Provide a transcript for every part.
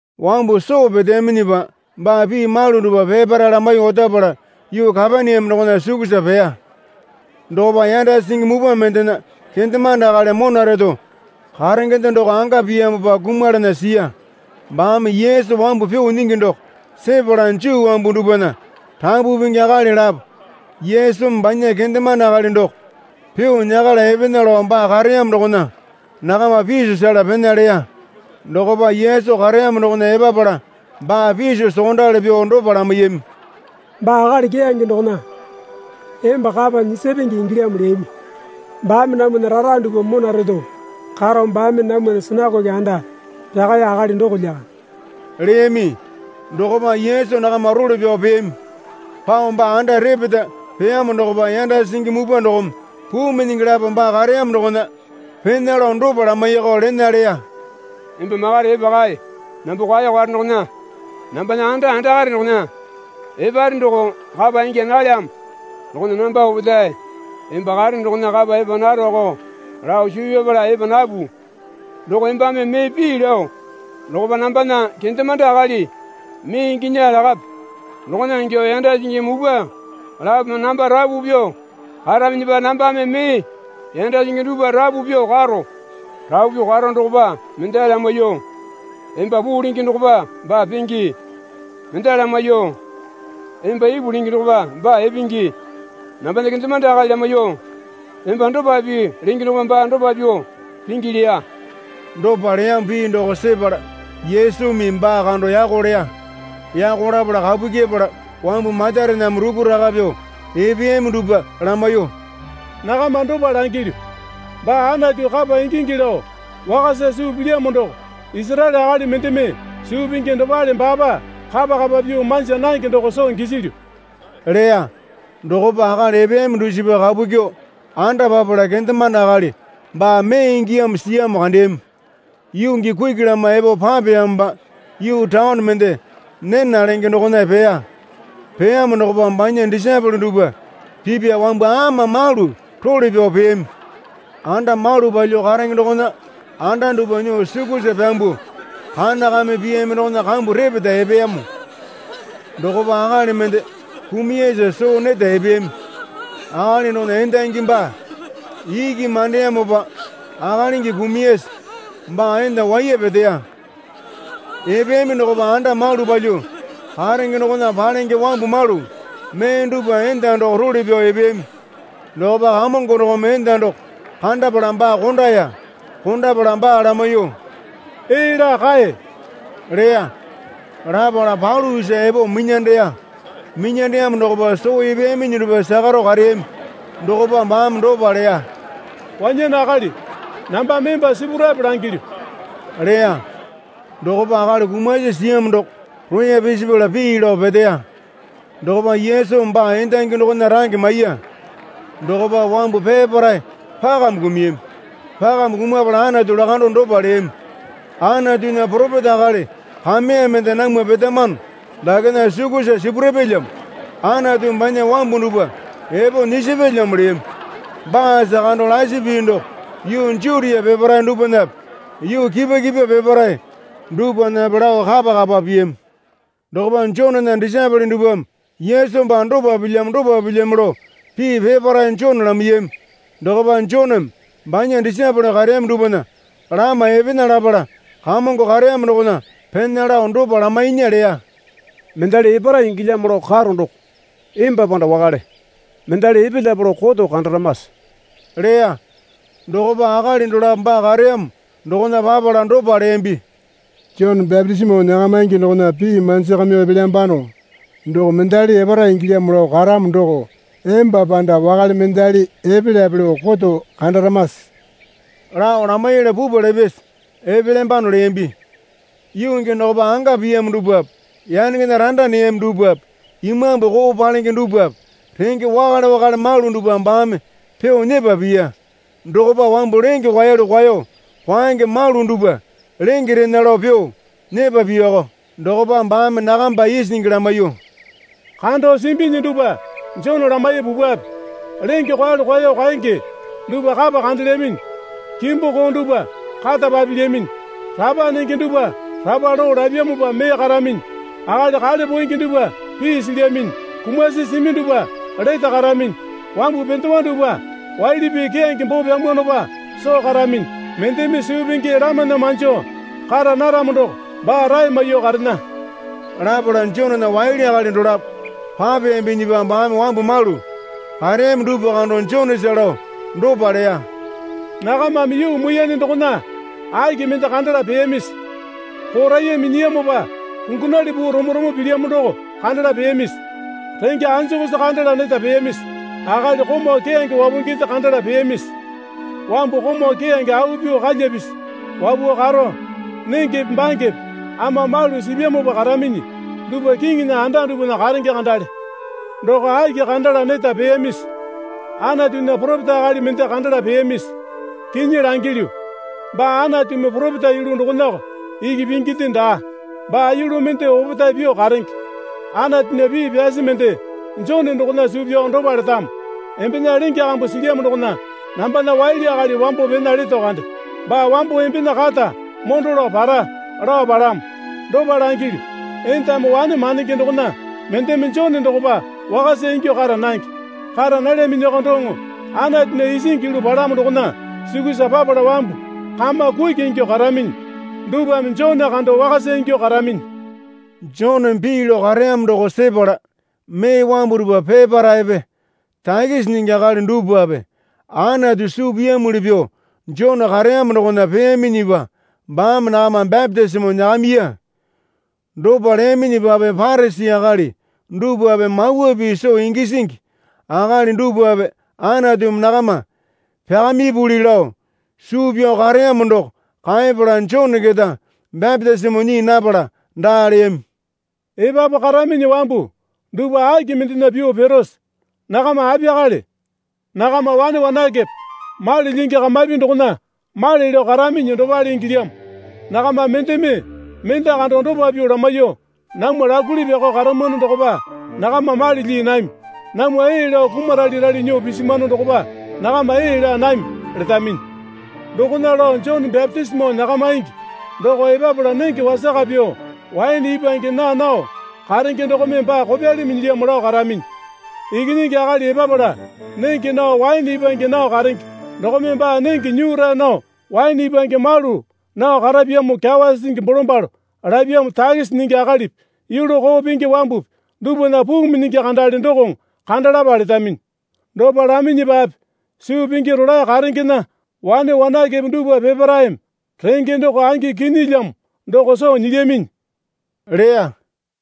Wambu soo peteyaminyipa baa pii malu dupwa peparae lamaiyuo otapala yuu Kapaneame dokona sukusa peya. Dokopa yanda singi mupwa mendena kendemande akali mona reto karengende doko anga piyamopa kumalana siya. Baame Yesu wambu pyuo nyingi doko sepala Juu wambu dupwana rapu pingi akali lapo Yesumi banya kendemande akali doko pyuo nyakala epena lao baa kareyamo dokona nakama piso sela pena leya. Dokopa Yesu kareyamo dokona epapala baa piso sokondali pyuo dopa lamaiyami. Baa akali keyange dokona emba kapa nyisapenge ingilyamo leyami. Baame namwana rara dupwa mona reto karo baame namwana sinakoke anda pyakaya akali doko lyakande, leyami. Dokopa Yesu nakama role pyao peyami. Pao baa anda repeta peyamo dokopa yanda singi mupwa dokome puu minyingi lapo baa kareyamo dokona pena lao dopa lamaiyakao lena leya. Emba makare, epa kae. Namba kwao karo dokona nambana anda andakare dokona eparene doko kapa ingya nalyamo. Dokona namba opetae emba karene dokona kapa epa naroko lao suu pyapala epa napu. Doko embame mee pii lao dokopa, nambana kendemande akali mee inginya lakape. Dokona ingyuo yanda singi mupwa lapome namba rapu pyuo karaminyipa nambame mee yanda singi dupwa rapu pyuo karo. Rapu pyuo karo dokopa mendali lamaiyuo, Emba puu lenge dokopa baa penge. Mendali lamaiyuo, Emba ipu lenge dokopa baa epenge. Nambana kendemande akali lamaiyuo, Emba dopa pii lenge dokopa baa dopa pyuo pingi, leya. Dopa leyamo pii doko sepala Yesumi baa kando yako leya. Yako lapala kapu kyepala wambu matarename rukuraka pyuo epeyami dupwa lamaiyuo, Nakama dopa langilyu, baa Anatu kapa ingingi lao wakasa suu pilyamo doko Isaraele akali mendeme suu pingi dopale baapa kapa kapa pyuo manja nange doko soo gisilyu leya. Dokopa akali epeyami dusipa kapu kyuo anda papala kendemande akali baa mee ingiyamo siyamo kandeyami. Yuu gii kuki lama epo papeyamopa yuu taone mende Nena lenge dokona peya. Peyamo dokopa banya disaepole dupwa pipya wambu ama malu role pyao peyami. Anda malu palyuo karenge dokona anda dupwa nyuo sukusa pyambuo kana kame piyami dokona kambu repeta epeyamo dokopa akali mende kumuyasa soo neta epeyami. Akali dokona endangi baa iki mandeyamopa akalingi kumuyasa baa enda waiya peteya. Epeyami dokopa anda malu palyuo karenge dokona palenge wambu malu mee dupwa enda doko role pyao epeyami. Dokopa Kamongo dokome enda doko kandapala baa kondaya. Kondapala baa lamaiyuo, Ee laa kae, leya. Lapala palu isa epo minyandeya. Minyandeyamo dokopa soo epeyaminyi dupwa sakaro kareyami. Dokopa baame dopa leya. Wanyane akali, nambame emba sipurape langilyu, leya. Dokopa akali kumasi siyamo doko roya pisipala pii lao peteya. Dokopa Yesumi baa endangi dokona range maiya. Dokopa wambu peparae pakame kumuyami. Pakame kumapala Anatu lakando dopa leyami. Anatunya poropeta akali kameya mende namwa petamano dakena sukusa sipurapyalyamo, Anatumi banya wambu dupwa epo nyisapyalyamo leyami. Baasa kando lasi pii doko yuu Jutia peparae dupwanape yuu kipwa kipwa peparae dupwanape lao kapakapa piyami. Dokopa Jonena disaepole dupwame Yesu baa dopa pilyamo dopa pilyamo lao pii peparae Jone lamaiyami. Dokopa Joneme banya disaepole kareyami dupwana lama epena lapala Kamongo kareyamo dokona pena lao dopa lamainya leya. Mendali epara ingilyamo lao karo doko emba panda wakale mendali epelyape lao koto kandaramase? leya. Dokopa akali dolapo baa kareyamo dokona papala dopa leyambi. Jone bapitisimo nyakamaingi dokona pii manjakamyuo epelyambano. Doko mendali epara ingilyamo lao karamo doko emba panda wakale mendali epelyape lao koto kandaramase? lao lamaiyala pupwa lapyasa epelyambano leyambi. Yuu gii dokopa anga piyamo dupwape yanengena randa neyami dupwape imambu koo palenge dupwape renge wakale wakale malu dupwa baame pyuo nyepa piya. Dokopa wambu lenge kwaeyalu kwaeyo kwaenge malu dupwa lenge rena lao pyuo nyepa piyako. Dokopa baame nakamba isingi lamaiyuo, Kando simbinyi dupwa Jone lamaiye pupwape. Lenge kwaeyalu kwaeyo kwaenge dupwa kapa kandelyaminyi, kimbu koo dupwa kata papilyaminyi, rapa nenge dupwa rapa loo lapyamopa mee karaminyi, akali kale poenge dupwa pii silyaminyi, kumasi simi dupwa lete karaminyi, wambu pendewa dupwa waili pii keyange boo pyamwanopa soo karaminyi. Mendeme suu pingi lamana manjo kara naramo doko baa rae maiyuo karena. Lapala Jonena waili akali dolapo papeyambinyipa baame wambu malu kareyami dupwa kando Jonesa lao dopa leya. Nakamame yuu muiyane dokona aki mende kandala peyamisi? Poraiya minyiyamopa kungunali puu romo romo pilyamo doko kandala peyamisi? Renge anjukusi kandala neta peyamisi? Akali komau keyange wapunginde kandala peyamisi? Wambu komau keyange au pyuo kalya pisi wapuo karo nengepe bangepe ama malu sipyamopa karaminyi dupa kiŋinya anda dupwana karenge kandale. Doko aki kandala neta peyamisi? Anatunya poropeta akali mende kandala peyamisi? Kinyi langilyu, baa Anatumi poropeta yulu dokonako iki pinginde daa. Baa yulu mende opetae pyuo karenge. Anatunya pii pyasi mende Jone dokona suu pyao dopa letamo. Embena lenge kambu silyamo dokona nambana waili akali wambo pena leto kande. Baa wamo embena kata mondo lao para, lao palamo. Dopa langilyu, endame wane mandenge dokona mendeme Jone dokopa wakasa ingyuo kara nange. Kara nalyaminyuoko doŋo Anatunya isingi yulu palamo dokona sukusa papala wambu kama kuki ingyuo karaminyi dupwame Jone kando wakasa ingyuo karaminyi. Joneme pii lao kareyamo doko sepala mee wambu dupwa peparaepe takisi nyingi akali dupwape Anatu suu piyamuli pyuo Jone kareyamo dokona peyaminyipa baame nakama bapitisimo nyakamiya. Dopa leyaminyipape Parisi akali dupwape Mawa Pii soo gisingi akali dupwape Anatumi nakama pyakamipuli lao suu pyao kareyamo doko kaepala Jone keta bapitisimo nyii napala daa leyami. Epapu karaminyi wambu dupwa aki mendena pyuo pirose? Nakama apiyakale? Nakama wane wanakepe mali lyingi kamapi dokona male lao karaminyi dopale ingilyamo. Nakama mendeme mende kando dopa pyuo lamaiyuo namwa lakuli pyakao karamwano dokopa nakama mali lyii nami, namwa ee lao kumaralerale nyuo pisimwano dokopa nakama ee laa nami, letaminyi. Dokona lao Jone bapitisimo nyakamaingi doko epapala nenge wasaka pyuo waene ipwange naa nao karenge dokome baa kopyali minyilyamo lao karaminyi. Ikinyingi Akali epapala nenge nao waene ipwange nao karenge dokome baa nenge nyura nao waene ipwange malu nao karapyamo kyawa sisingi bolombalo lapyamo takisi nyingi akalipi yulu koo pingi wambupi dupwana puu minyingi kandale dokoŋo kandalapa letaminyi. Dopa laminyipape suu pingi rolae karengena wane wanakepe dupwa peparaeme renge doko angi kinyilyamo doko soo nyilyaminyi leya.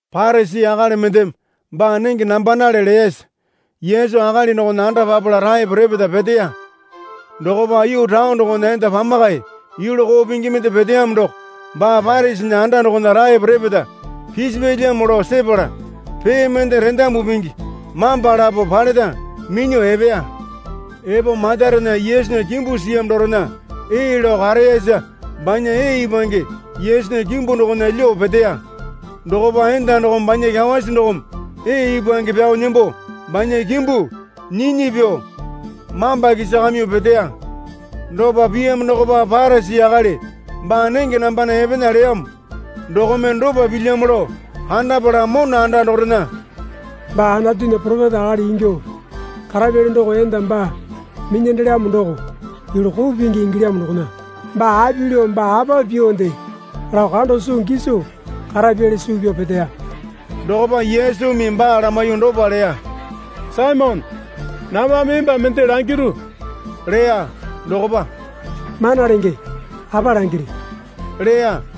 Parisi akali mendeme baa nenge nambanale leyasa Yesu akali dokona anda papala taepo repeta peteya. Dokopa yuu taone dokona enda pamakae yulu koo pingi mende peteyamo doko baa Parisinya anda dokona taepo repeta pisipyalyamo lao sepala pee mende rendamu pingi mamba lapo paleta minyuo epeya. Epo matarena Yesunya kimbu siyamo dorena ee lao kareyara banya ee ipwange Yesunya kimbu dokona lyuo peteya. Dokopa enda dokome banya kyawasi dokome ee ipwange pyao nembo banya kimbu nyinyi pyuo mamba kisakamyuo peteya. Dopa piyamo dokopa Parisi akali baa nenge nambana epena leyamo dokome dopa pilyamo lao kandapala mona anda dorena, Baa Anatunya poropeta akali ingyuo karapyali doko enda baa minyandelyamo doko yulu koo pingi ingilyamo dokona baa api lao baa apa pyuonde lao kando soo giso karapyali suu pyao peteya. Dokopa Yesumi baa lamaiyuo dopa leya. Saimone, nambame emba mende langiru leya. Dokopa, Mana Lenge, apa langiri? leya.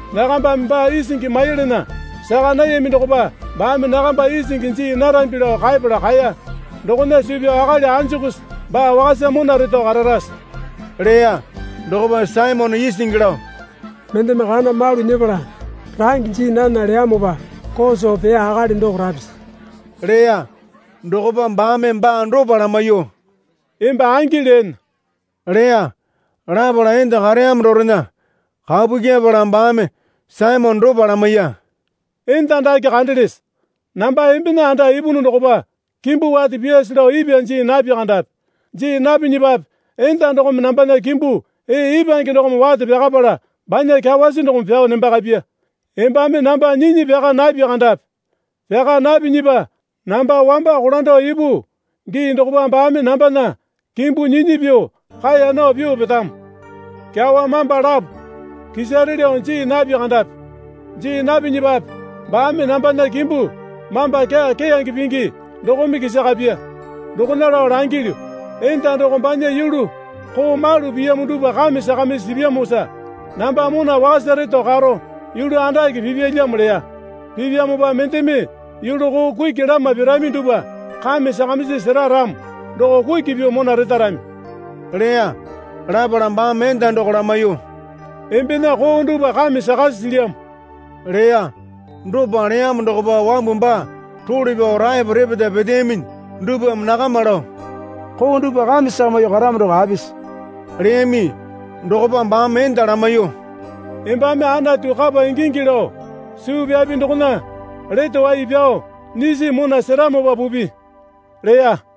Nakambame baa isingi maiyalana saka nayami dokopa baame nakamba isingi jii narambi lao kaepala kaeya. Dokona suu pyao akali anjukusi baa wakasa mona reto kararase? leya. Dokopa Saimone isingi lao, Mendeme kana malu nyepala range jii nana leyamopa koo soo peya akali doko rapisi? leya. Dokopa baame baa dopa lamaiyuo, Emba angi leene leya. Lapala enda kareyamo dorena kapu kyepala baame Saimone dopa lamaiya, Enda dake kandelese? Namba embena anda ipunu dokopa kimbu wate pyaase lao ipwa jii napi kandapi. Jii napinyipape enda dokome nambana kimbu ee ipwange dokome wate pyakapala banya kyawasi dokome pyao nembakapya. Embame namba nyinyi pyaka napi kandapi. Pyaka napinyipa namba wamba kolando ipu gii dokopa baame nambana kimbu nyinyi pyuo kaeya nao pyuo petamo. Kyawa mamba lapo kisare lao jii napi kandapi. Jii napinyipape baame nambana kimbu mamba kyaa keyange pingi dokome kisakapya. Dokona lao langilyu, Enda doko banya yulu koo malu piyamo dupwa kame sakamisi sipyamosa namba mona wakasa reto karo yulu andake pipyalyamo leya. Pipyamopa mendeme yulu koo kuki lama pirami dupwa kame sakamisi sera ramo doko kuki pyuo mona retarami, leya. Lapala baame enda doko lamaiyuo, Embena koo dupwa kame sakasi silyamo leya. Dopa leyamo dokopa wambu baa role pyao taepo repeta peteyaminyi dupwame nakama lao, Koo dupwa kame sakamyuoko karamo doko apisi? leyami. Dokopa baame enda lamaiyuo, Embame Anatu kapa ingingi lao suu pyapi dokona lete wai pyao nyisi mona seramopa pupi, leya.